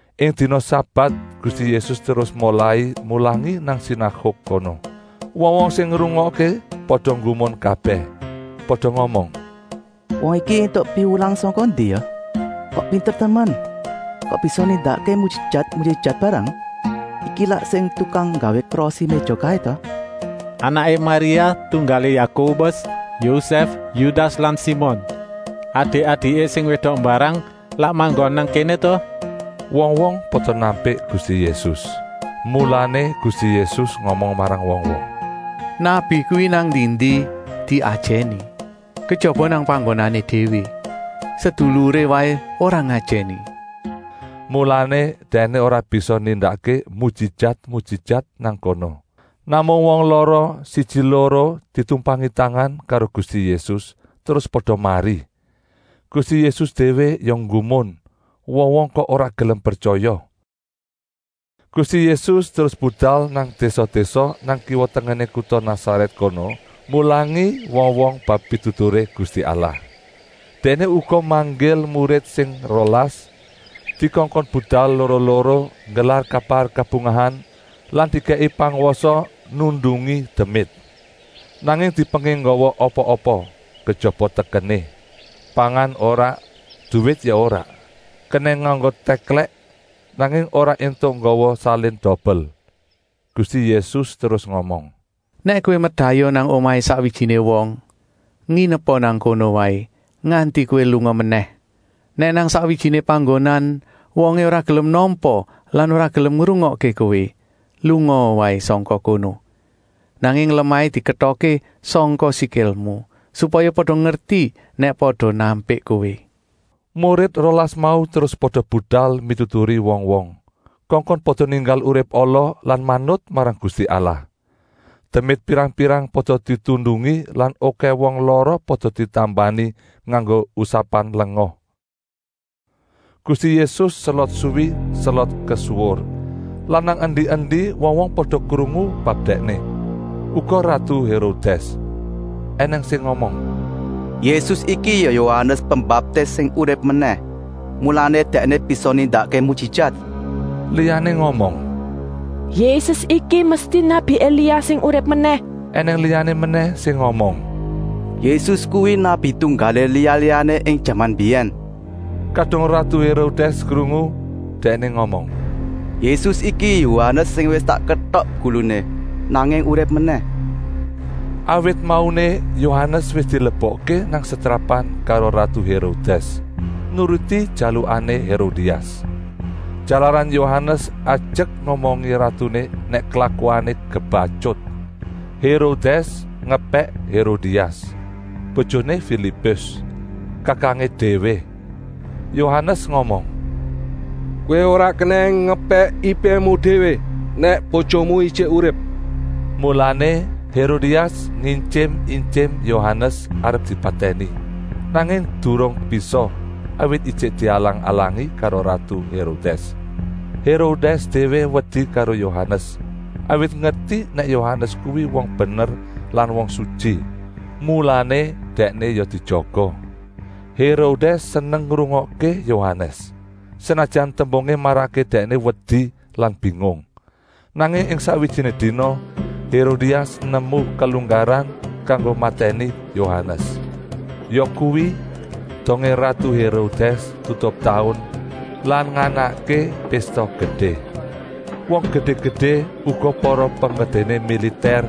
Ing dina sabat Gusti Yésus terus molai mulangi nang sinaguk kono. Wong-wong sing ngrungokké pada nggumun kabèh. Pada ngomong: “Wong iki éntuk piwulangan sangka ngendi ya? Kok pinter temen? Kok bisa nindakké mujijat-mujijat mbarang? Iki lak sing tukang nggawé krosi-méja kaé ta? Anaké Maria, tunggalé Yakobus, Yoses, Yudas lan Simon. Adik-adiké sing wédok mbarang lak manggon nang kéné ta?” Wong-wong pada nampik Gusti Yésus. Mulané Gusti Yésus ngomong marang wong-wong: “Nabi kuwi nang endi-endi diajèni, kejaba nang panggonané déwé. Seduluré déwé waé ora ngajèni.” Mulané Dèkné ora bisa nindakké mujijat-mujijat nang kono. Namung wong lara siji-loro ditumpangi tangan karo Gusti Yésus, terus pada mari. Gusti Yésus déwé ya nggumun, wong-wong kok ora gelem pretyaya. Gusti Yésus terus budal nang désa-désa nang kiwa-tengené kuta Nasarèt kono, mulangi wong-wong bab pituturé Gusti Allah. Dèkné uga manggil murid sing rolas dikongkon budal loro-loro nggelar kabar kabungahan lan dikèki pangwasa nundungi demit. Nanging dipenging nggawa apa-apa, kejaba tekené. Pangan ora, duwit ya ora. Kenèng nganggo tèklèk, nanging ora éntuk nggawa salin dobel. Gusti Yésus terus ngomong: “Nèk kowé merdayoh nang omahé sakwijiné wong, nginepa nang kono waé nganti kowé lunga menèh. Nèk nang sakwijiné panggonan wongé ora gelem nampa lan ora gelem ngrungokké kowé, lungaa waé sangka kono. Nanging lemahé diketokké sangka sikilmu, supaya pada ngerti nèk pada nampik kowé.” Murid rolas mau terus pada budal mituturi wong-wong, kongkon pada ninggal urip ala lan manut marang Gusti Allah. Demit pirang-pirang pada ditundungi lan okèh wong lara pada ditambani nganggo usapan lenga. Gusti Yésus selot suwi selot kesuwur lan nang endi-endi wong-wong pada krungu bab Dèkné, uga ratu Hérodès. Enèng sing ngomong: “Yésus iki ya Yohanes Pembaptis sing urip menèh, mulané Dèkné bisa nindakké mujijat.” Liyané ngomong: “Yésus iki mesti nabi Elia sing urip menèh.” Enèng liyané menèh sing ngomong: “Yésus kuwi nabi tunggalé liya-liyané ing jaman mbiyèn.” Kadung ratu Hérodès krungu, dèkné ngomong: “Yésus iki Yohanes sing wis tak ketok guluné, nanging urip menèh.” Awit mauné Yohanes wis dilebokké nang setrapan karo ratu Hérodès, nuruti jalukané Hérodias. Jalaran Yohanes ajek ngomongi ratuné nèk klakuané kebatyut. Hérodès ngepèk Hérodias, bojoné Filipus, kakangé déwé. Yohanes ngomong: “Kowé ora kenèng ngepèk ipému déwé nèk bojoné ijik urip!” Mulané Hérodias ngintyim-intyim Yohanes arep dipatèni, nanging durung bisa, awit ijik dialang-alangi karo ratu Hérodès. Hérodès déwé wedi karo Yohanes, awit ngerti nèk Yohanes kuwi wong bener lan wong sutyi, mulané dèkné ya dijaga. Hérodès seneng ngrungokké Yohanes, senajan tembungé marakké dèkné wedi lan bingung. Nanging ing sakwijiné dina Hérodias nemu kelunggaran kanggo matèni Yohanes, yakuwi, dongé ratu Hérodès tutup taun lan nganakké pésta gedé; wong gedé-gedé, uga para penggedéné militèr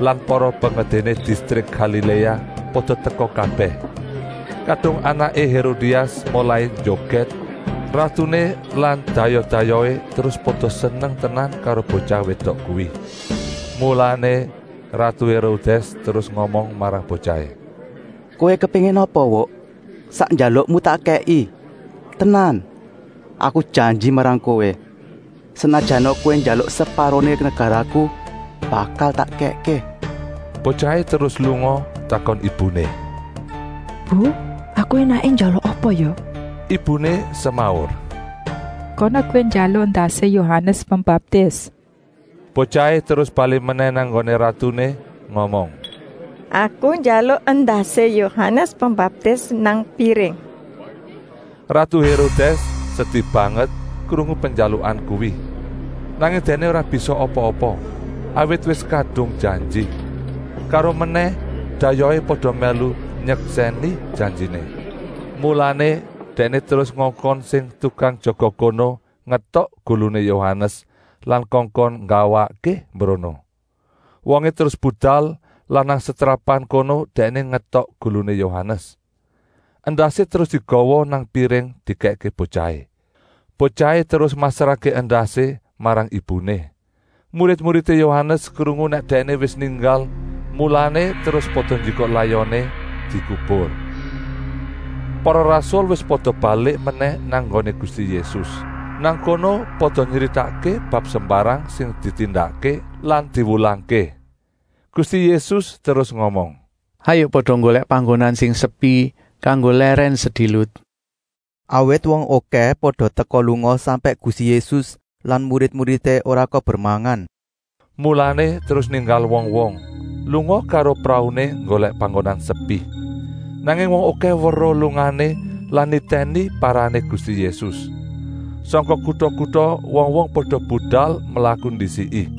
lan para penggedéné distrik Galiléa pada teka kabèh. Kadung anaké Hérodias molai njogèt, ratuné lan dayoh-dayohé terus pada seneng tenan karo botyah wédok kuwi. Mulané ratu Hérodès terus ngomong marang botyahé: “Kowé kepéngin apa Wuk, sak njalukmu tak kèki. Tenan, aku janji marang kowé, senajana kowé njaluk separoné negaraku, bakal tak kèkké!” Botyahé terus lunga takon ibuné: “Bu, aku énaké njaluk apa ya?” Ibuné semaur: “Kana kowé njaluk endasé Yohanes Pembaptis!” Botyahé terus balik menèh nang nggoné ratuné ngomong: “Aku njaluk endasé Yohanes Pembaptis nang piring!” Ratu Hérodès sedi banget krungu penjalukan kuwi. Nanging dèkné ora bisa apa-apa, awit wis kadung janji. Karomenèh dayohé pada mèlu nyeksèni janjiné. Mulané dèkné terus ngongkon sing tukang jaga kono ngetok guluné Yohanes lan kongkon nggawakké mbrono. Wongé terus budal lan nang setrapan kono dèkné ngetok guluné Yohanes. Endasé terus digawa nang piring dikèkké botyahé. Botyahé terus masrahké endasé marang ibuné. Murid-muridé Yohanes krungu nèk dèkné wis ninggal, mulané terus pada njikuk layoné dikubur. Para rasul wis pada balik menèh nang nggoné Gusti Yésus. Nang kono pada nyritakké bab sembarang sing ditindakké lan diwulangké. Gusti Yésus terus ngomong: “Hayuk pada nggolèk panggonan sing sepi kanggo lèrèn sedilut.” Awit wong okèh pada teka-lunga sampèk Gusti Yésus lan murid-muridé ora kober mangan. Mulané terus ninggal wong-wong lunga karo prauné nggolèk panggonan sepi. Nanging wong okèh weruh lungané lan nitèni parané Gusti Yésus. Sangka kuta-kuta wong-wong pada budal mlaku ndisiki.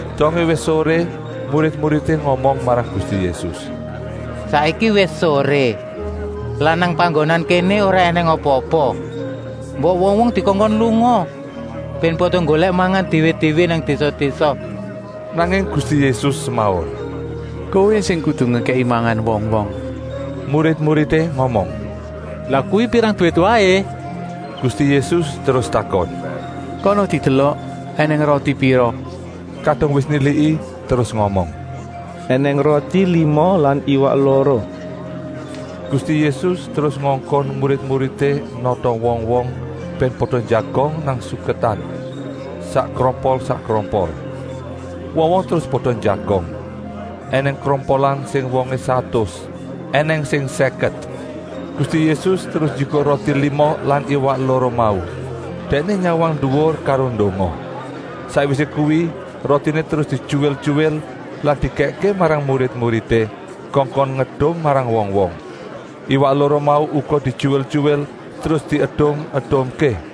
Dongé wis soré murid-muridé ngomong marang Gusti Yésus: “Saiki wis soré lan nang panggonan kéné ora ènèng apa-apa. Mbok wong-wong dikongkon lunga bèn pada nggolèk mangan déwé-déwé nang désa-désa.” Nanging Gusti Yésus semaur: “Kowé sing kudu ngekèki mangan wong-wong.” Murid-muridé ngomong: “Lah kuwi pirang duwit waé?” Gusti Yésus terus takon: “Kana didelok ènèng roti pira!” Kadung wis niliki terus ngomong: “Enèng roti lima lan iwak loro!” Gusti Yésus terus ngongkon murid-muridé nata wong-wong, bèn pada njagong nang suketan, sakkrompol-sakkrompol. Wong-wong terus pada njagong; ènèng krompolan sing wongé satus, ènèng sing sèket. Gusti Yésus terus njikuk roti lima lan iwak loro mau. Dèkné nyawang nduwur karo ndonga. Sakwisé kuwi rotiné terus dityuwil-tyuwil lan dikèkké marang murid-muridé kongkon ngedum marang wong-wong. Iwak loro mau uga dityuwil-tyuwil terus diedum-edumké.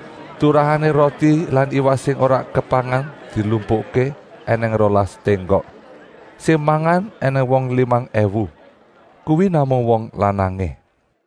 Turahané roti lan iwak sing ora kepangan dilumpukké ènèng rolas ténggok. Sing mangan ènèng wong limang èwu, kuwi namung wong lanangé.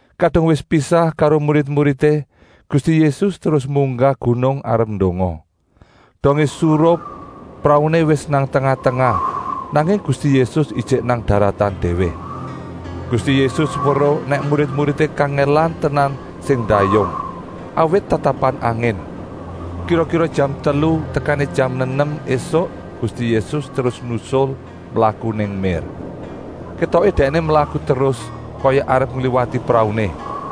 Kadung wis pisah karo murid-muridé, Gusti Yésus terus munggah gunung arep ndonga. Dongé surup prauné wis nang tengah-tengah, nanging Gusti Yésus ijik nang daratan déwé. Gusti Yésus weruh nèk murid-muridé kangèlan tenan sing ndayung, awit tatapan angin. Kira-kira jam telu tekané jam nenem ésuk Gusti Yésus terus nusul, mlaku nang mér. Kétoké Dèkné mlaku terus, kaya arep ngliwati prauné.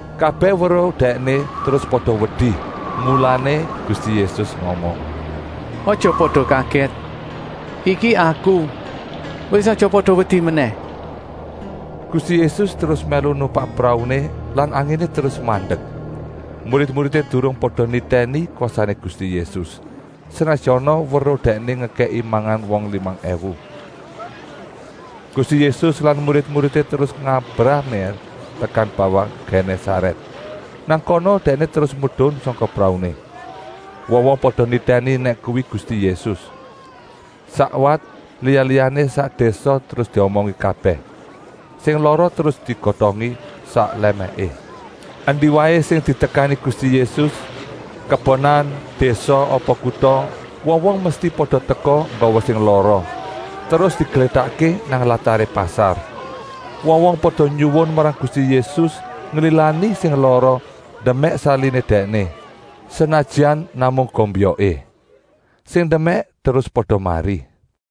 Kabèh weruh Dèkné terus pada wedi. Mulané Gusti Yésus ngomong: “Aja pada kagèt! Iki Aku! Wis aja pada wedi menèh!” Gusti Yésus terus mèlu numpak prauné lan anginé terus mandek. Murid-muridé durung pada nitèni kwasané Gusti Yésus, senajana weruh Dèkné ngekèki mangan wong limang èwu. Gusti Yésus lan murid-muridé terus ngabrah mér tekan bawah Genésarèt. Nang kono terus medun sangka prauné. Wong-wong pada nitèni nèk kuwi Gusti Yésus. Sakwat liya-liyané sak désa terus diomongi kabèh. Sing lara terus digotongi sak lèmèké. Endi waé sing ditekani Gusti Yésus, kebonan, désa apa kuta, wong-wong mesti pada teka nggawa sing lara, terus diglétakké nang lataré pasar. Wong-wong pada nyuwun marang Gusti Yésus nglilani sing lara ndemèk saliné Dèkné, senajan namung gombyoké. Sing ndemèk terus pada mari.